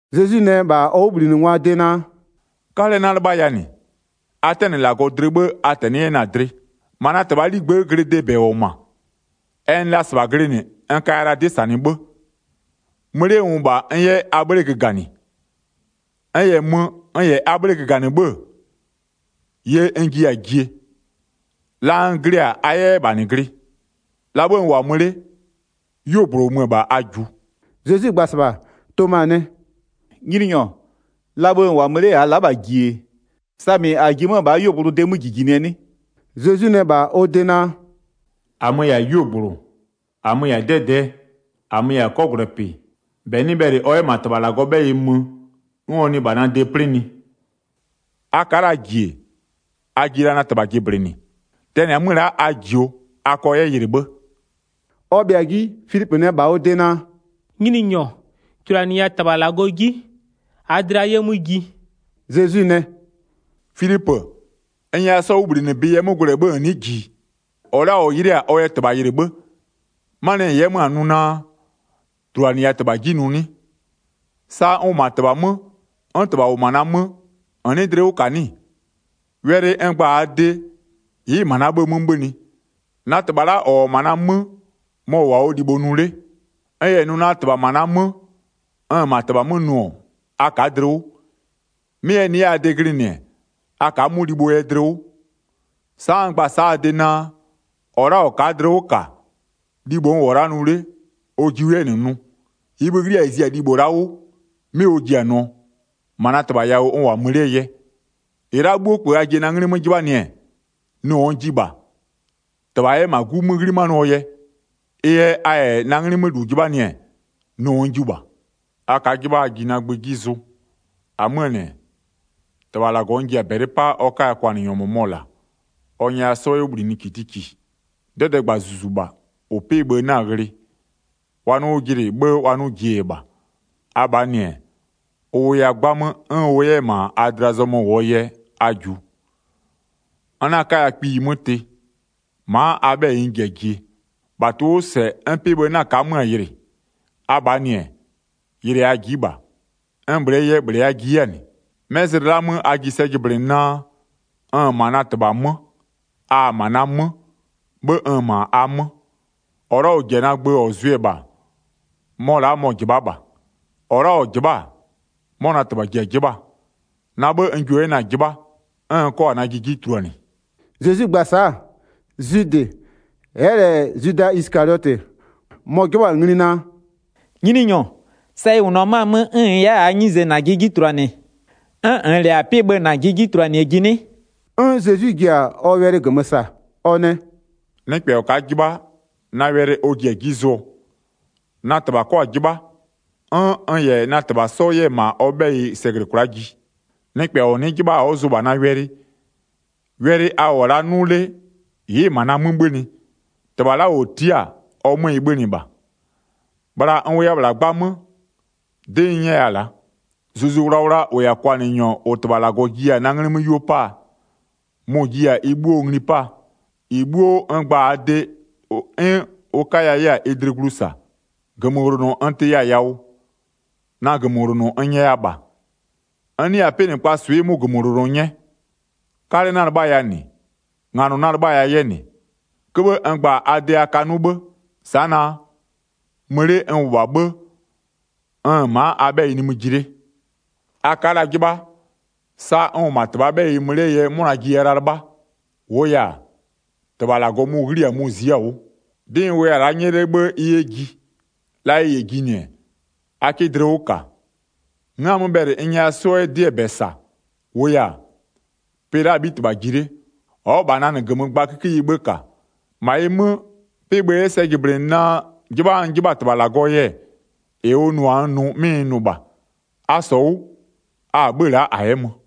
Zezwi nɛ -bha ɔ 'wʋbhlinɩngwaa de naa: “'Kalɛ 'na-a 'lɩbhaya -nɩ. A 'tɛnɩ -Lagɔ dlɩ 'bhë a -tɛnɩ'ɩ 'yɛ na-a dlɩ. 2-Ma na -Tɩbhaa 'ligbë'ë glɩdee -bɛ -wʋ-ɔ -ma, ɛ nɩ la -sɩbha glɩnɩ, n kaya la 'dɩ -sanɩ 'bhë. Mö 'le n -wʋ -bha, n 'yɛ a 'bhle göganɩ. N -yɛ mö, n -yɛ a 'bhle göganɩ 'bhë-ë, ye n jiya-a jie, la n glɩ-a a 'yɛ 'yɛ -bha -nɩ glɩ. La 'bhë n -wʋ-a mö 'le, 'yuogblʋ -ʋ mö-ö -bha a -jiʋ.” Zezwi gba-a -sɩbha, Toma nɛ: “Nyininyɔ, la bhë -n -wʋ-a mö 'le, -aa la'a -bha -ji-e, samɩ -a ji-e 'mö-a -bhaa 'yuogblʋ de 'mö -jijinɩɛ 'nɩ?” Zezwi nɛ -bha ɔ de naa: “-Amö-ö -yɛ-a 'yuogblʋ, -amö-ö -yɛ-a 'dɛdɛɛ, -amö-ö -yɛ-a 'kɔgwlɛpɩ. -Bɛ 'nɩ bhɛlɩ ɔ 'yɛ -ma -Tɩbha -Lagɔɔ 'bhɛyɩ mö, 'n ɔ nɩ -bha na de 'plɩnɩ. A ka'a la -ji-e, a ji la na -Tɩbha jɩblɩnɩ. Tɛnɩ-a 'mö la'a a -jio, a kɔ 'yɛ yɩlɩ 'bhë.” Ɔ bhɩa-a 'ji, Filipö nɛ -bha ɔ de naa: “Nyininyɔ, -tuluanɩya -Tɩbha -Lagɔ 'ji -aa dlɩa 'yɛ 'mö ji.” Zezwi nɛ: “Filipö, n nyɛya 'sɔɔ 'wʋbhlinɩbɩ yɛ 'mö gwlɛ 'bhë -n nɩ'ɩ -ji-i? -Ɔ la'a -ɔ -yɩlɩ'ɩ-a ɔ yɛ -Tɩbha yɩlɩ 'bhë. 'Manɩɛ yɛ -n 'yɛ 'mö-a nʋ naa: -Tuluanɩya -Tɩbha 'ji nʋ 'nɩ? Sa n -wʋ -ma -Tɩbha 'mö, 'n -Tɩbha -wʋ -ma na 'mö, -n 'nɩɩ dlɩ 'wʋ -ka 'nɩ-ɩ? Wɛlɩ n gba-a a de, ɩ'ɩ-ɩ -ma na 'bhë 'mö 'bhönɩ, na -Tɩbha la'a -ɔ -wʋ-ɔ -ma na 'mö, mɔ-ɔ -wʋ-a ɔ libho nʋ 'le. N -yɛ nʋ naa, -Tɩbha -ma na 'mö, n-n -ma -Tɩbha 'mö nʋ-ɔ, a ka'a dlɩ 'wʋ, 'mɩ ɛ nɩ 'yɛ a de glɩnɩ-ɛ, a ka'a 'mʋ libhoo yɛ dlɩ 'wʋ. Sa'a n gba-a sa'a a de naa: -Ɔ la'a -ɔ ka'a dlɩ 'wʋ -ka, libho n -wʋ-ɔ la'a nʋ 'le, ɔ jiʋ 'yɛ -nɩ nʋ, -ɩɩ bhï-ï 'ghli-a -ɩ zi-a libho la'a 'wʋ, 'mɩ ɔ ji-a nʋɔ, -ma -Tɩbha yawʋ n -wʋ-a mö 'lee yɛ. 13-Ɩ la'a 'bhuo -kpö a ji-e na 'nglɩ 'mö 'jɩbhanɩɛ, nʋɔ n jiɩ -bha, -Tɩbha 'yɛ -ma 'Gu 'mö 'ghlimanɩɔɔ yɛ. Ɩ yɛ a -yɛ na 'nglɩ 'mö -lu 'jɩbhanɩ-ɛ, nʋɔ n jiʋ -bha.” “A ka'a 'jɩbha a ji na gbö 'ji zʋ. 16-Amöö -nɩ-ɛ, -Tɩbha -Lagɔ n ji-a -bɛlɩ 'paa ɔ 'kaya kwanɩnyɔ -mʋmɔ -la, ɔ nyɛya 'sɔ 'yɛ 'wʋ -bhlinɩ -kitiki. 'Dɛdɛɛgba -Zuzu -bha, -ʋ 'pɩ-ɩ bhë 'na-a ghlɩ, wa 'nʋ 'wʋ jɩnɩ 'bhë, wa 'nʋ -jie yɛ -bha. Abhaa -nɩ-ɛ, ʋ wʋya 'gbamö 'n ʋ 'yɛ 'yɛ-ɛ -ma a dlɩa zɔmöö yɛ, a -jiʋ. N 'na 'kaya kpiyi 'mö tɩ, ma'a a 'bhɛyɩ n ji-a jie. 19-Bha tʋ-ʋ 'wʋ -sɛ 'n 'pɩ-ɩ bhë 'na ka'a 'mö-a yɩlɩ, Abhaa -nɩ-ɛ, yɩlɩɛ a ji'i -bha, n -bhlɩɛ yɛ -bhlɩ a ji 'yɛ-a -nɩ. 'Mɛ zlɩ la'aa 'mö a ji sɛ jɩblɩnɩ naa: N-n -ma na -Tɩbha 'mö, a-a -ma na 'mö, 'bhë n-n -ma a 'mö. 21-Ɔ la'a -ɔ -ji-a na gbö 'n ɔ zʋɩ-ɛ -bha, mɔ la'a mɔ-ɔ -jɩbha'a -bha. -Ɔ la'a -ɔ -jɩbha'a-a, 'mɔ na -Tɩbha ji-a 'jɩbhaa, na 'bhë n jio 'yɛ na-a 'jɩbha, 'n n 'kɔ-a najɩ 'ji tuluanɩ.” Zezwi gba-a sa'a, Zwidɩ, ɛ'ɛ -lɛ Zwida Isɩkaliɔtɩ, mɔ-ɔ 'jɩbhɔ-a ngli naa: “Nyininyɔ, sa ɩ -wʋnʋ-ɔ 'mö-a 'mö 'n -n 'yɛ-a -aa 'nyize -najɩ 'ji tuluanɩ, 'n -nn -lɛ-a 'pɩ-ɩ bhë -najɩ 'ji tuluanɩɛ ji 'nɩ?” 'N Zezwi ji-a ɔ wɛlɩ -gömö -sa, ɔ nɛ: “Nɩkpɛ -ɔ ka'a 'jɩbha, na wɛlɩ ɔ ji-a 'ji zʋɔ, na -Tɩbha 'kɔ-a 'jɩbha, 'n n -yɛ na -Tɩbha 'sɔ 'yɛ-ɛ -ma ɔ 'bhɛyɩ sɛ -glɩ kwla'a ji. Nɩkpɛ -ɔ nɩ'ɩ 'jɩbha ɔ'ɔ zʋ -bha na wɛlɩ. Wɛlɩ a -wʋ-ɔ la'a 'nʋ 'le ɩ'ɩ-ɩ -ma na 'mö 'bhönɩ, -Tɩbha la'a -ɔ tia'a-a, ɔ 'mö ɩ 'bhönɩ -bha. Bhla n wʋya -bhla 'gbamö, 'dɩ n 'nyɛya-a la'a. Zuzu Wlawla -ʋ -yɛ-a kwanɩnyɔ -ʋ -Tɩbha -Lagɔ jiya-a na 'nglɩ 'mö 'yuo 'paa, mʋ-ʋ jiya-a ɩ 'bhuo ngli 'paa, -ɩ 'bhuo n gba-a a de, 'n ʋ 'kaya 'yɛ-a ɩ dlɩ glu -sa. 27-Gömöwlonɔ n tɩya-a yawʋ, na -gömöwlonɔ n nyɛya -bha, n 'nɩya-a 'pɩnɩkpaa swɩ 'mʋ -gömöwlonɔ 'nyɛ. 'Kalɛ 'na-a 'lɩbhaya -nɩ, nganɔ 'na-a 'lɩbhaya 'yɛ -nɩ. 'Köbhë n gba-a a de a ka 'nʋ 'bhë, sa'a naa: Mö 'le n -wʋ-a 'bhë, n-n ma'a a 'bhɛyɩ nimï ji 'le. A ka'a la 'jɩbha, sa n -wʋ -ma -Tɩbhaa 'bhɛyɩ mö 'lee yɛ 'mʋna jiya la-a 'lɩbhaa, -wʋʋ yɛ-a, -Tɩbha -Lagɔ mʋ-ʋ 'ghli-a mʋ-ʋ zi'i-a 'wʋ. 'Dɩ n wʋya-a la'a 'nyɛ 'le 'bhë ɩ 'yɛ ji. La ɩ -yɛ jinɩ-ɛ, a 'kɩ dlɩ 'wʋ -ka. N'n-a 'mö bhɛlɩ n nyɛya 'sɔ 'yɛ 'dɩɛ -bɛ -sa, -wʋʋ yɛ-a, pɩ la'aa 'bhitɩbha-a ji 'le, ɔ'ɔ -bha na -nɩ -gömö gba 'kikeyie 'bhë -ka. 31-Ma ɩ 'mö, 'pɩ-ɩ bhë 'yɛ sɛ -jɩblɩnɩ naa 'jɩbha n 'jɩbha-a -Tɩbha -Lagɔɔ yɛ, -ɩ ʋ nʋ-a n nʋ 'mɩ n nʋ -bha. A -sɔ 'wʋ, a-a 'bhö-ö la'a -a 'yɛ mö.